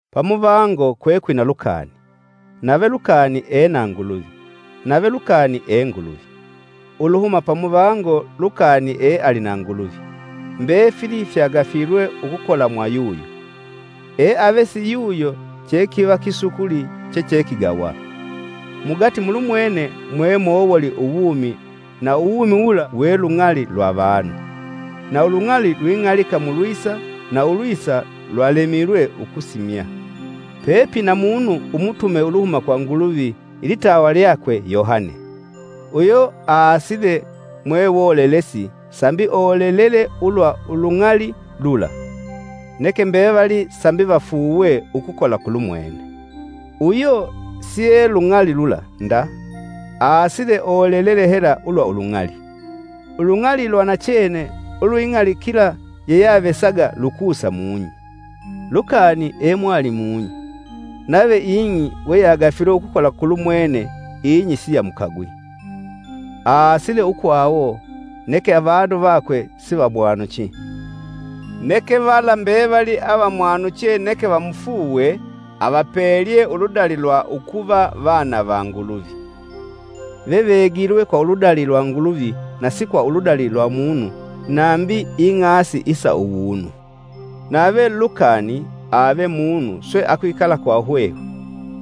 Pamuvango kwekwina lukani, nave lukani e na Nguluvi, nave lukani e Nguluvi. Uluhuma pamuvango lukani e ali na Nguluvi. Mbefili fyagafilwe ukukola mwa yuyo; eave si yuyo chekiva kisukuli chechekigawa. Mugati mulumwene mwe mowoli uwumi na uwumi wula we lung'ali lwa avanu. Na ulung'ali lwing'alika mulwisa na ulwisa, lwalemilwe ukusimya. Pepina munu umutume uluhuma kwa Nguluvi ilitawa lyakwe Yohane, uyo aasile mwewolelesi sambi olelele ulwa ulung'ali lula. Neke mbevali sambi vafuuwe ukukola kulumwene. Uyo sie lung'ali lula nda aasile olelele hela ulwa ulung'ali. Ulung'ali lwa nachene ulwing'alikila yeyeavesaga lukusa mung'i. Lukani emwali mung'i, nave ing'i we yagafilwe ukukola kulumwene ing'i siyamukagwi. Aasile ukwawo, neke avanu vakwe sivamwanuchi. Neke vala mbevali avamwanuche neke vamufuuwe avapelye uludali lwa ukuva vana va Nguluvi. Vevegilwe kwa uludali lwa Nguluvi na si kwa uludali lwa munu nambi ing'asi isa uwunu. Nave Lukani ave munu swe akwikala kwa hwehwe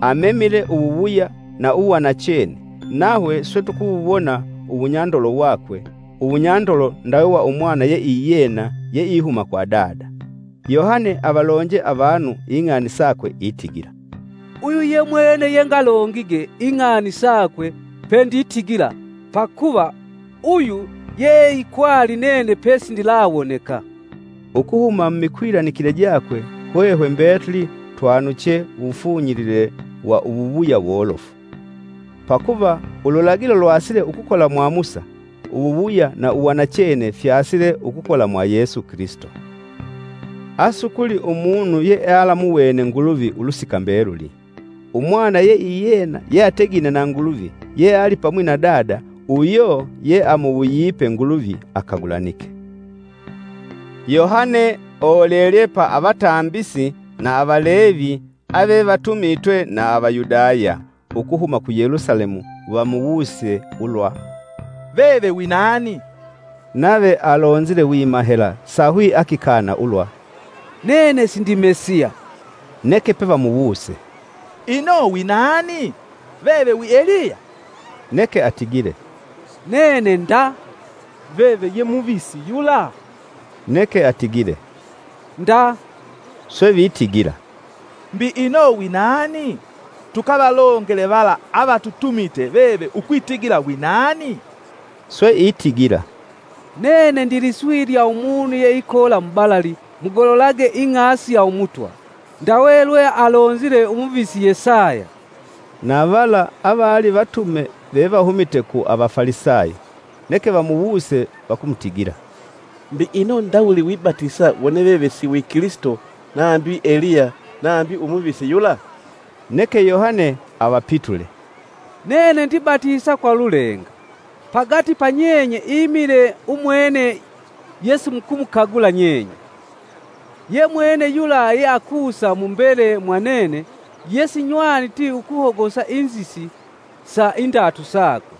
amemile uwuwuya na uwanachene, nahwe swe tukuwuwona uwunyandolo wakwe, uwunyandolo ndawe wa Umwana yeiyena yeihuma kwa Dada. Yohane avalonje avanu ing'ani sakwe itigila, “Uyu ye mwene yengalongige ing'ani sakwe penditigila: ‘Pakuva uyu yeeikwali nene pesindilawoneka.’” Ukuhuma mumikwilanikile jakwe hwehwe mbetuli twanuche uwufunyilile wa uwuwuya wolofu. Pakuva ululagilo lwasile ukukola mwa Musa, uwuwuya na uwanachene fyasile ukukola mwa Yesu Kilisito. Asukuli umunu yealamuwene Nguluvi ulusika mbeluli. Umwana yeiyena yeategine na Nguluvi, yealipamwi na Dada, uyo yeamuwuyipe Nguluvi akagulanike. Yohane olelelye pa Avatambisi na Avalevi avevatumitwe na Avayudaya ukuhuma ku Yelusalemu vamuwuse ulwa, “Veve wi nani?” Nave alonzile wima hela sahwi akikana ulwa, “Nene sindi Mesiya.” Neke pevemuwuse, “Ino winani? Veve wi Eliya?” Neke atigile, “Nene nda?” Veve ye muvisi yula neke atigile, “Nda!” swe vitigila, “Mbi ino winani? Tukavalongele vala avatutumite veve ukwitigila winani?” Swe itigila, “Nene ndiliswi lya umunu yeikoola mubalali mugololage ing'asi ya Umutwa, ‘Ndawe lwe alonzile umuvisi Yesaya.’” Na vala avali vatume vevahumite ku Avafalisayo, neke vamuwuse vakumutigila, “Mbi ino ndawuli wibatisa wone veve si wi Kilisito nambi Eliya nambi umuvisi yula?” Neke Yohane avapitule, “Nene ndibatisa kwa lulenga pagati pa nyenye imile umwene yesimukumukagula nyenye. Ye mwene yula yeakusa mu mbele mwa nene yesinywanite ukuhogosa inzisi sa indatu sakwe.”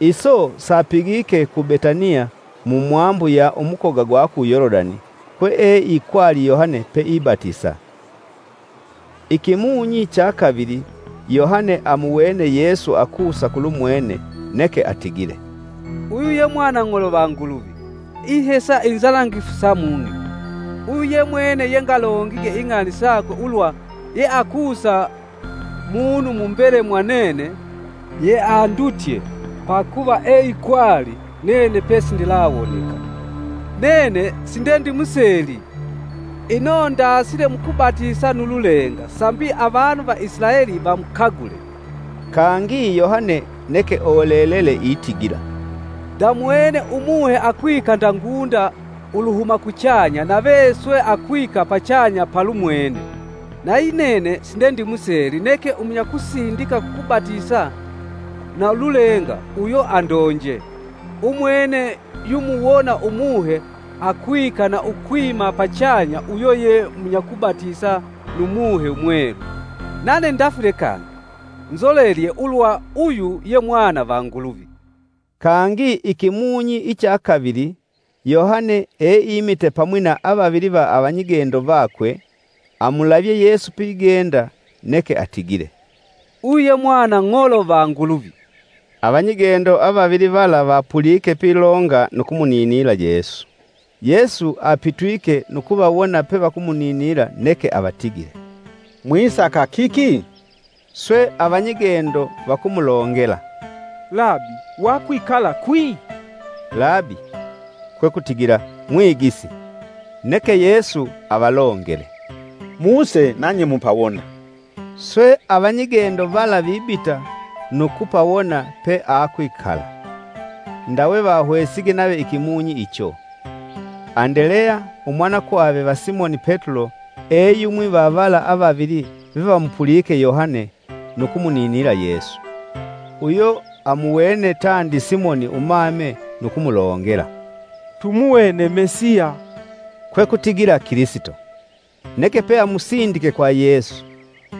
Iso sapigike ku Betaniya mu mwambu ya umukoga gwa ku Yolodani, kweeikwali Yohane peibatisa. Ikimunyi cha kavili Yohane amuwene Yesu akusa kulumwene, neke atigile, “Uyu ye mwanang'olo va Nguluvi, ihesa inzanangifu sa mung'i! Uyu ye mwene yengalongige ing'ani sakwe ulwa, ‘Yeakusa munu mu mbele mwa nene, yeandutye pakuva eikwali nene pesindilawoneka!’ Nene sindendimuseeli, ino ndasile mukubatisa nu lulenga sambi avanu va Isilaeli vamukagule.” Kangi Yohane neke olelele itigila: “Ndamuwene umuhe akwika nda ngunda uluhuma kuchanya nave swe akwika pachanya palumwene. Nayinene sindendimuseeli neke umunyakusindika kukubatisa na ululenga uyo andonje: ‘Umwene yumuwona Umuhe akwika na ukwima pachanya uyo ye munyakubatisa nu Muhe Mwelu.’ Nane ndafile kangi nzolelelye ulwa uyu ye Mwana va Nguluvi.” Kangi ikimunyi icha kavili, Yohane eimite pamwi na avavili va avanyigendo vakwe. Amulavye Yesu pigenda neke atigile, “Uyu ye mwanang'olo va Nguluvi.” Avanyigendo avavili vala vapulike pilonga nu kumuninila Yesu. Yesu apitwike, nu kuvawona pevakumuninila neke avatigile, “Mwisaka kiki?” Swe avanyigendo vakumulongela, “Labi wakwikala kwi?” (Labi-kwe kutigila “Mwigisi”) Neke Yesu avalongele, “Muse nanye mupawona.” Swe avanyigendo vala vibita nu kupawona peakwikala ndawe vahwesige nave ikimunyi icho. Andeleya, umwanakwave va Simoni Petulo, eyumwi va vala avavili vevamupulike Yohane nu kumuninila Yesu. Uyo amuwene tandi Simoni umame nu kumulongela, “Tumuwene Mesiya.” (kwekutigila Kilisito) Neke peamusindike kwa Yesu.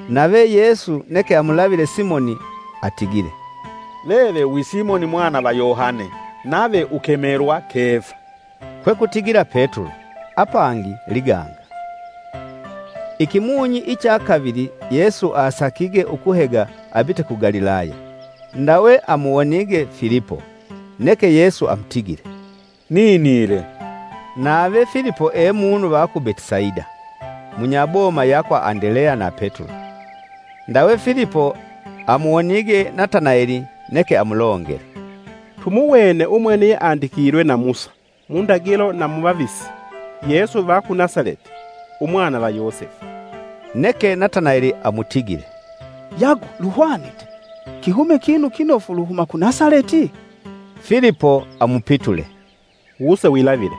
Nave Yesu neke amulavile Simoni atigile, “Veve wi Simoni Mwana va Yohane, nave ukemelwa Kefa.” (Kwekutigila Petulo, apangi, “Liganga”.) Ikimunyi icha kavili Yesu asakige ukuhega abite ku Galilaya, Ndawe amuwonige Filipo. Neke Yesu amutigile, “Ninile.” Nave Filipo e munu va ku Betisaida, munyaboma ya kwa Andeleya na Petulo. Ndawe Filipo amuwonige Nataneli neke amulongele, “Tumuwene umwene yeandikilwe na Musa mundagilo na mu vavisi Yesu va ku Nasaleti Umwana va Yosefu.” Neke Natanaeli amutigile, “Yagu luhwanite, kihume kinu kinofu uluhuma ku Nasaleti?” Filipo amupitule, “Wuse wilavile.”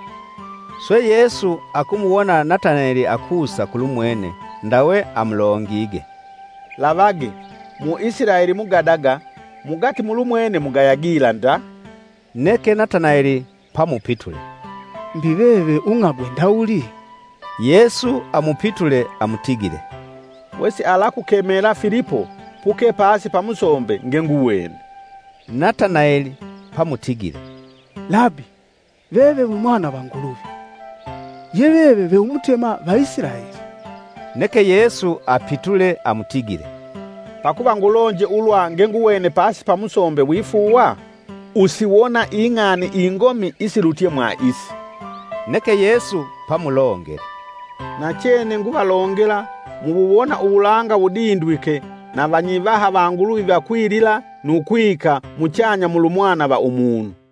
Swe Yesu akumuwona Natanaeli akusa kulumwene ndawe amulongige, “Lavage! mu Isilaeli mugadaga mugati mulumwene mugaya gila nda.” Neke Natanaeli pamupitule, “Mbi veve ung'agwe ndawuli?” Yesu amupitule amutigile, “Wesialakukemela Filipo puke pasi pa musombe ngenguwene.” Nataneli pamutigile, “Labi, veve wi Mwana va Nguluvi. Ye veve ve Umutema va Isilaeli!” Neke Yesu apitule amutigile, “Pakuva ngulonje ulwa ngenguwene pasi pa musombe wifuuwa? Usiwona ing'ani ingomi isilutye mwa isi” Neke Yesu pamulongele, “Nachene nguvalongela muwuwona uwulanga wudindwike na vanyivaha va Nguluvi vakwilila nu kwika muchanya mulu Mwana va Umunu.”